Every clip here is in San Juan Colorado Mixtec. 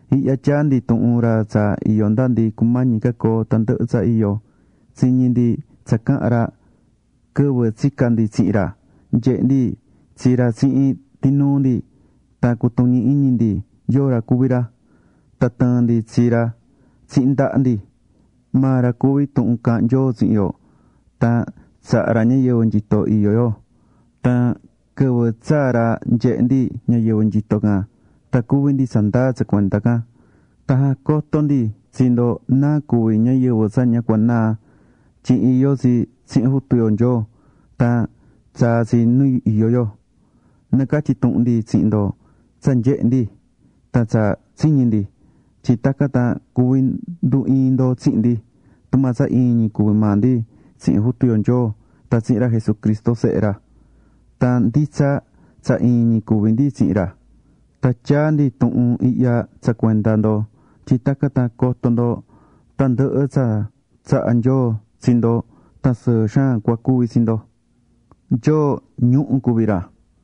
Ihya tyaá ndi tuhun ra tsa iyó nda ndi cumañi coo tandɨhɨ tsa iyó. Tsiñi̱ ndi tsa caha̱n ra quɨvɨ tsica̱ ndi tsihin ra. Nyehe̱ ndi tsi ra tsihin tinuu ndi tan cutuñi̱ iñi ndi yóo ra cuví ra. Tan tɨɨ̱n ndi tsi ra tsihin ndaha ndi. Maa ra cuví Tuhun Caahán Nyoo tsihin yo. Tan tsaha̱ ra ñayɨvɨ nyito iyó yo. Tan quɨvɨ tsaa̱ ra nyehe̱ ndi ñayɨvɨ nyito can tan cuví ndi tsandaa tsa cuenda can. Tan jacotó ndi tsi ndo náa cuví ñayɨvɨ tsa ña cua naa tyin iyó tsi tsihin Jutu yo Nyoo, tan tsaa̱ tsi nu iyó yo. Nacatyí tuhun ndi tsihin ndo tsa nyehe̱ ndi tan tsa tsiñi̱ ndi. Tyin tacan tan cuvi ndu iin ndo tsihin ndi, tumaa tsa iin ñi cuví maa ndi tsihin Jutu yo Nyoo tan tsihin ra Jesucristo, Sehe ra. Tan nditsa tsa iin ñi cuví ndi tsihin ra. Tan tyaá ndi tuhun ihya tsa cuenda ndo tyin tacan tan coto ndo tandɨhɨ tsa tsahá Nyoo tsi ndo tan sɨɨ xaan cua cuvi tsi ndo.Nyoo, ñuhu̱ cuví ra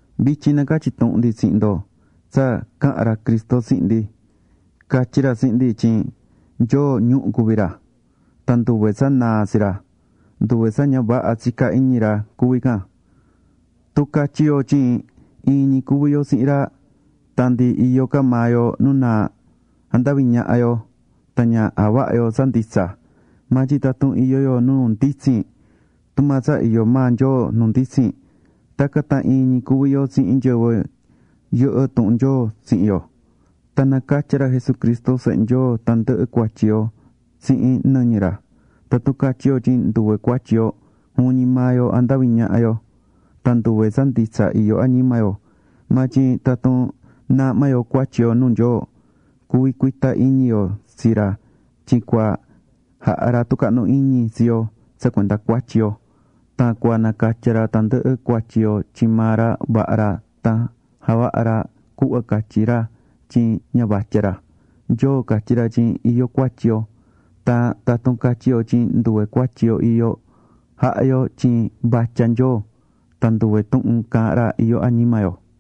Vityin nacatyí tuhun ndi tsihin ndo tsa caha̱n ra Cristo tsihin ndi. Catyi̱ ra tsihin ndi tyin Nyoo ñuhu̱ cuví ra. Tan nduve tsa naa tsi ra, [nduve tsa ña vaha tsicá iñi ra cuví can]. Tun catyí yo tyin iin ñi cuví yo tsihin ra, tan ndi iyó ca maa yo nu naa, jandaví ñaha yo tan ña javahá yo tsa nditsa. Maa tyin tatun iyó yo nu nditsin, tumaa tsa iyó maa Nyoo nu nditsin, tacan tan iin ñi cuví yo tsihin nyɨvɨ yɨhɨ́ tuhun Nyoo tsihin yo, tan nacatyá ra Jesucristo Sehe Nyoo tandɨhɨ cuatyi yo tsihin nɨñɨ ra. Tatun catyí yo tyin nduve cuatyi yo, juvin ñi maa yo jandaví ñaha yo, tan nduve tsa nditsa iyó añima yo. Maa tyin tatun naahmá yo cuatyi yo nuu Nyoo, cuví cuita iñi yo tsi ra tyin cua jaha ra tucahnu iñi tsi yo tsa cuenda cuatyi yo tan cua nacatya ra tandɨhɨ cuatyi yo tyin maa ra vaha ra tan javahá ra cuhva catyí ra tyin ña vatya ra. [Nyoo catyí ra tyin iyó cuatyi yo], tan tatun catyí yo tyin nduve cuatyi yo iyó, jahá yo tyin vatya Nyoo. Tan nduve tuhun caahán ra, iyó añima yo.